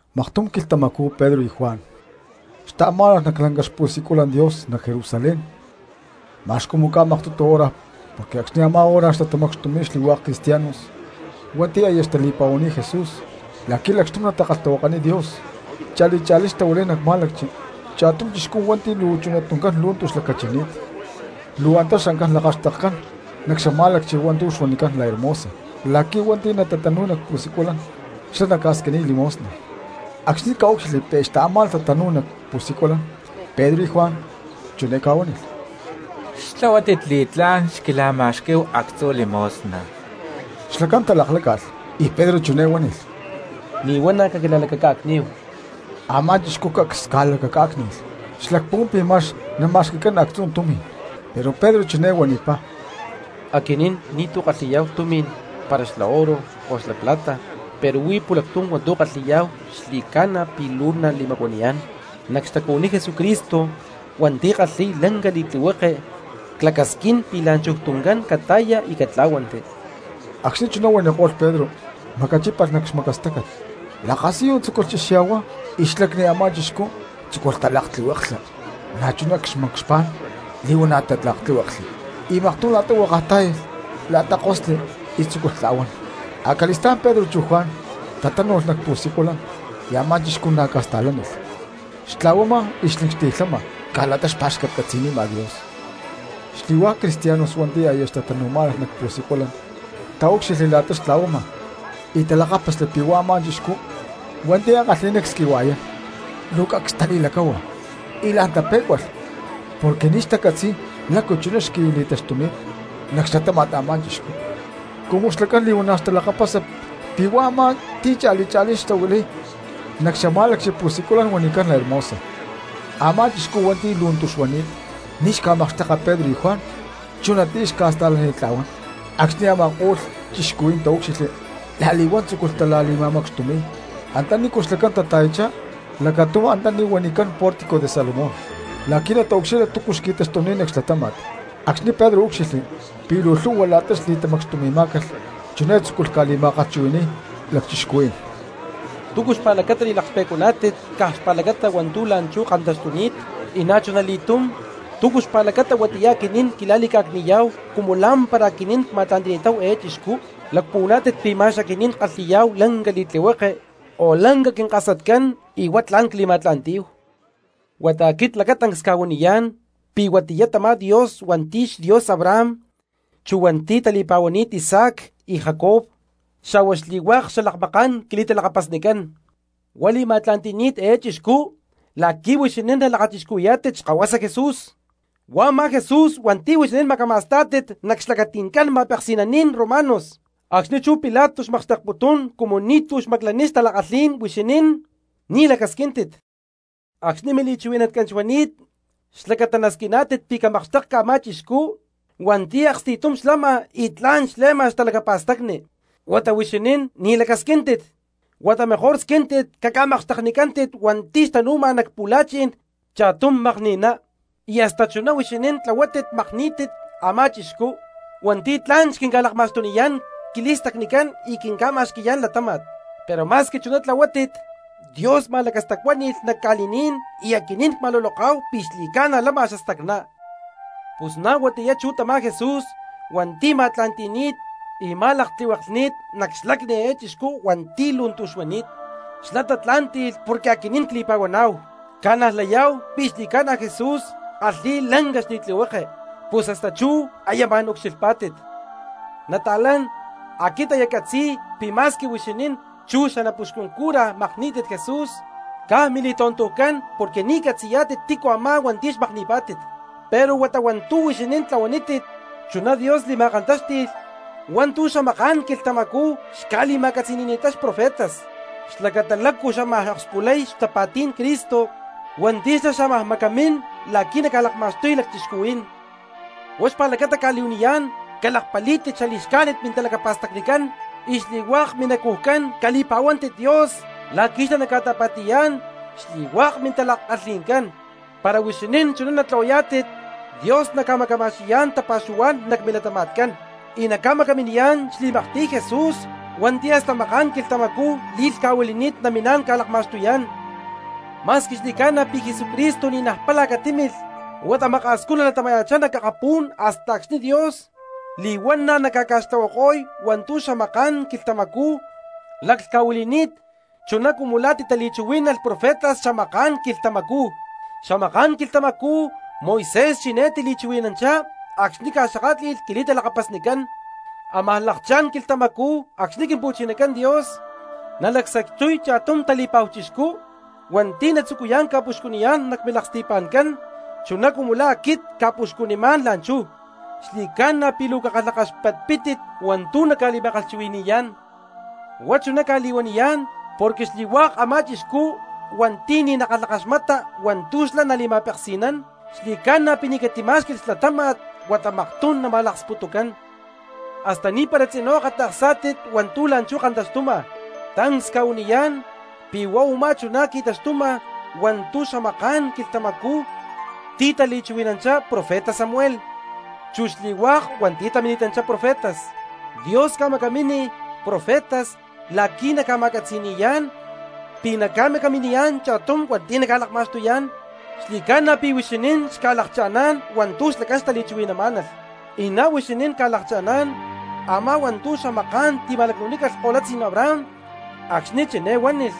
Maktum quilhtamacú Pedro y Juan xtaamá̠nalh nac lanca xpu̠siculan Dios nac Jerusalén, ma̠x cumu ca̠maktutu hora porque acxni̠ a̠má hora xtatamacxtumi̠y xli̠hua̠k cristianos hua̠nti̠ aya xtali̠pa̠huani̠t Jesús la̠qui̠ lacxtum natakalhtahuakaniy Dios. Cha̠li cha̠lí xtahuilay nac má̠lacchi cha̠tum chixcú hua̠nti̠ luu chunatuncán lu̠ntu xlacachini̠t. Luu antá xancán lakaxtekcán nac xamá̠lacchi hua̠ntu̠ xuanicán La Hermosa la̠qui̠ hua̠nti̠ natatanúy nac pu̠siculan xlá naca̠squiniy limosna. Acxni̠ ca̠úcxilhli pi̠ xtaamá̠nalh tatanu̠y nac pu̠siculan Pedro y Juan, chiné ca̠huánilh: —¡Xtlahuátit li̠tlá̠n xquila̠ma̠xquí̠hu actzu limosna! Xlacán talakláca̠lh, y Pedro chiné huánilh: —Li̠huana̠ caquila̠lacaca̠cní̠hu. Amá chixcú cacs ca̠lacacá̠cni̠lh, xlacpuhuán pi̠ ma̠x nama̠xqui̠cán actzu tumi̠n. Pero Pedro chiné huanipá: —Aquinín ni̠tu̠ ckalhi̠yá̠hu tumi̠n para xla oro o xla plata, pero huí pu̠lactum hua̠ntu̠ ckalhi̠yá̠hu xli̠ca̠na pi̠ luu nali̠macuaniyá̠n: nac xtacuhuiní Jesucristo hua̠nti̠ kalhi̠y lanca li̠tlihueke clacasquín pi̠ la̠nchuj tuncán cata̠ya y catlá̠huanti. Acxni̠ chuná huaniko̠lh Pedro macachípalh nac xmacastácat, lakasiyu tzúculh chexya̠huay y xlacni a̠má chixcú tzúculh talaktlihueklha, na̠chuná xcha̠xpá̠n li̠huana̠ tatlíhueklhli. Y maktum la̠ta huakaj tá̠yalh la̠ta kosli y tzúculh tla̠huán. Acali̠stá̠n chú Pedro chu Juan tatánu̠lh nac pu̠siculan y a̠má chixcú na̠ ca̠sta̠lánilh, xtla̠huama y xlincxti̠lhama caj la̠ta xpa̠xcatcatzi̠nima Dios. Xli̠hua̠k cristianos hua̠nti̠ aya xtatanu̠má̠nalh nac pu̠siculan taúcxilhli la̠ta xtla̠huama y talakápasli pi̠ huá a̠má chixcú hua̠nti̠ ankalhi̠ná csquihua̠yán. Luu cacs tali̠lacáhua y la̠n tapé̠cualh porque ni̠ xtacatzi̠y lácu chuná xqui̠li̠taxtuni̠t nac xlatáma̠t a̠má chixcú cumu xlacán li̠huana̠ xtalakapasa pi̠ huá a̠má ti̠ cha̠li cha̠lí xtahuilay nac xamá̠lacchi pu̠siculan huanicán La Hermosa. Amá chixcú hua̠nti̠ lu̠ntu xuani̠t ni̠ xca̠makxtekma Pedro y Juan chunatiyá xca̠sta̠lanitla̠huán. Acxni̠ a̠ma̠ko̠lh cristianos taúcxilhli la̠li̠huán tzúculh tali̠tamacxtumi̠y antanícu xlacán tata̠yachá lacatum antaní huanicán Pórtico de Salomón la̠qui̠ nataucxilha túcu xqui̠taxtuni̠t nac xlatáma̠t. Acxni̠ Pedro úcxilhli pi̠ luu lhu̠hua la̠ta li̠tamacxtumí̠calh chiné tzúculh ca̠li̠ma̠kalhchuhui̠ni̠y cristianos: —¿Túcu xpa̠lacata li̠laklhpe̠cuaná̠tit caj xpa̠lacata hua̠ntu̠ la̠nchú kantaxtuni̠t? Y na̠chuna li̠túm, ¿túcu xpa̠lacata huatiyá aquinín quila̠li̠ca̠cni̠yá̠hu cumu lá̠mpara aquinín cma̠tla̠nti̠ni̠táhu eé chixcú? ¿Lacpuhuaná̠tit pi̠ ma̠x aquinín ckalhi̠yá̠hu lanca li̠tlihueke o lanca quinkasatcán y huá tla̠n cli̠ma̠tla̠ntí̠hu? Huata aquit lacatancs cca̠huaniyá̠n pi̠ huatiyá tamá Dios hua̠nti̠ xDios Abraham, chú hua̠nti̠ tali̠pa̠huani̠t Isaac y Jacob xa̠hua xli̠hua̠k xalakmaká̠n quili̠talakapasnicán, huá li̠ma̠tla̠nti̠ni̠t eé chixcú la̠qui̠ huixinín nalakachixcuhui̠yá̠tit xkahuasa Jesús, huá a̠má Jesús hua̠nti̠ huixinín macama̠stá̠tit nac xlacati̠ncán ma̠peksi̠naní̠n romanos, acxni̠ chú Pilato xmakxtekputún cumu ni̠tu̠ xmaclaniy xtala̠kalhí̠n huixinín, ni̠ lacasquíntit. Acxni̠ mili̠chuhui̠natcán xuani̠t xlacata nasquiná̠tit pi̠ camakxtékcalh a̠má chixcú hua̠nti̠ aksti̠tum xlama y tla̠n xle̠ma xtalacapa̠stacni, huata huixinín ni̠ lacasquíntit, huata mejor squíntit caca̠makxteknicántit hua̠nti̠ xtanu̠ma nac pu̠la̠chi̠n cha̠tum makni̠ná. Y hasta chuná huixinín tlahuátit makní̠tit a̠má chixcú hua̠nti̠ tla̠n xquinca̠lakma̠xtuniyá̠n quili̠stacnicán y quinca̠ma̠xqui̠yá̠n latáma̠t. Pero ma̠squi chuná tlahuátit, Dios ma̠lacastacuáni̠lh nac ca̠li̠ní̠n y aquinín cma̠luloká̠hu pi̠ xli̠ca̠na lama xastacná. Pus na̠ huatiyá chú tamá Jesús hua̠nti̠ ma̠tla̠nti̠ni̠t y ma̠laktlihueklhni̠t nac xlacni eé chixcú hua̠nti̠ lu̠ntu xuani̠t; xlá tatlá̠nti̠lh porque aquinín cli̠pa̠huaná̠hu, cca̠najlayá̠hu pi̠ xli̠ca̠na Jesús kalhi̠y lanca li̠tlihueke, pus hasta chú aya ma̠n ucxilhpá̠tit. ’Nata̠lán, aquit aya ccatzi̠y pi̠ ma̠squi huixinín chu xanapuxcun cura makní̠tit Jesús, caj mili̠tontujcán porque ni̠ xcatzi̠yá̠tit tícu a̠má hua̠nti̠ xmakni̠pá̠tit. Pero huata hua̠ntu̠ huixinín tlahuanítit chuná Dios li̠ma̠kantáxti̠lh hua̠ntu̠ xamaká̠n quilhtamacú xca̠li̠ma̠catzi̠ni̠ni̠ttá xprofetas xlacata lácu xámaj akspulay xtapa̠tí̠n Cristo hua̠nti̠ xlá xámaj macamín la̠qui̠ naca̠lakma̠xtuy cristianos. Huá xpa̠lacata cca̠li̠huaniyá̠n, calakpalí̠tit xali̠xcájnit mintalacapa̠stacnicán y xli̠hua̠k minacujcán cali̠pa̠huántit Dios la̠qui̠ xlá naca̠ta̠pa̠ti̠yá̠n xli̠hua̠k mintala̠kalhi̠ncán. Para huixinín chuná natlahuayá̠tit, Dios naca̠macaminiyá̠n tapa̠xuhuá̠n nac milatama̠tcán y naca̠macaminiyá̠n xli̠maktiy Jesús hua̠nti̠ hasta maká̠n quilhtamacú li̠lhca̠huili̠ni̠t namín ca̠lakma̠xtuyá̠n. Ma̠squi xli̠ca̠na pi̠ Jesucristo ni̠naj pála catímilh, huata maka̠scú natilatama̠ya̠chá nac akapú̠n hasta acxni̠ Dios li̠huana̠ naca̠ca̠xtlahuako̠y hua̠ntu̠ xamaká̠n quilhtamacú laclhca̠huili̠ni̠t chuná cumu la̠ titali̠chuhuí̠nalh profetas xamaká̠n quilhtamacú. Xamaká̠n quilhtamacú Moisés chiné tili̠chuhui̠nanchá acxni̠ ca̠xakátli̠lh quili̠talakapasnicán: “¡Amaj lakchá̠n quilhtamacú acxni̠ Quimpu̠chinacán Dios nalacsacxtuy cha̠tum tali̠pa̠hu chixcú hua̠nti̠ natzucuyá̠n ca̠puxcuniyá̠n nac milaksti̠pa̠ncán chuná cumu la̠ aquit cca̠puxcunimá̠n la̠nchú! Xli̠ca̠na pi̠ luu cakalhakaxpatpítit hua̠ntu̠ naca̠li̠ma̠kalhchuhui̠ni̠yá̠n. Huá chuná cca̠li̠huaniyá̠n porque xli̠hua̠k a̠má chixcú hua̠nti̠ ni̠ nakalhakaxmata hua̠ntu̠ xlá nali̠ma̠peksi̠nán, xli̠ca̠na pi̠ ni̠ catimá̠xqui̠lh xlatáma̠t huata maktum nama̠laksputucán.” ’Hasta ni̠para tzinú akata̠ksá̠tit hua̠ntu̠ la̠nchú kantaxtuma. Tancs cca̠huaniyá̠n pi̠ huá u̠má chuná qui̠taxtuma hua̠ntu̠ xamaká̠n quilhtamacú titali̠chuhui̠nanchá profeta Samuel, chu xli̠hua̠k hua̠nti̠ tamini̠tanchá profetas. Dios ca̠macámi profetas la̠qui̠ naca̠li̠ma̠catzi̠ni̠yá̠n pi̠ naca̠macaminiyá̠n cha̠tum hua̠nti̠ naca̠lakma̠xtuyá̠n; xli̠ca̠na pi̠ huixinín xca̠lakcha̠ná̠n hua̠ntu̠ xlacán xtali̠chuhui̠namá̠nalh, y na̠ huixinín ca̠lakcha̠ná̠n a̠má hua̠ntu̠ xamaká̠n tima̠lacnu̠nícalh kolutzí̠n Abraham acxni̠ chiné huánilh: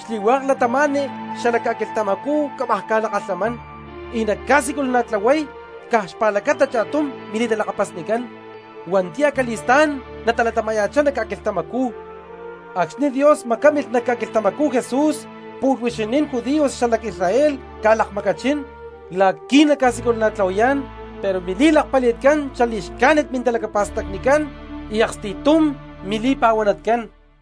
“Xli̠hua̠k cristianos xala ca̠quilhtamacú cámaj ca̠lakalhamán y nacca̠siculana̠tlahuay caj xpa̠lacata cha̠tum mili̠talakapasnicán hua̠nti̠ acali̠stá̠n natalatama̠ya̠chá nac ca̠quilhtamacú.” Acxni̠ Dios macámilh nac ca̠quilhtamacú Jesús pu̠lh huixinín judíos xalac Israel ca̠lakmacachín la̠qui̠ naca̠siculana̠tlahuayá̠n, pero mili̠lakpali̠tcán xalacli̠xcájnit mintalakapa̠stacnicán y aksti̠tum mili̠pa̠huanatcán.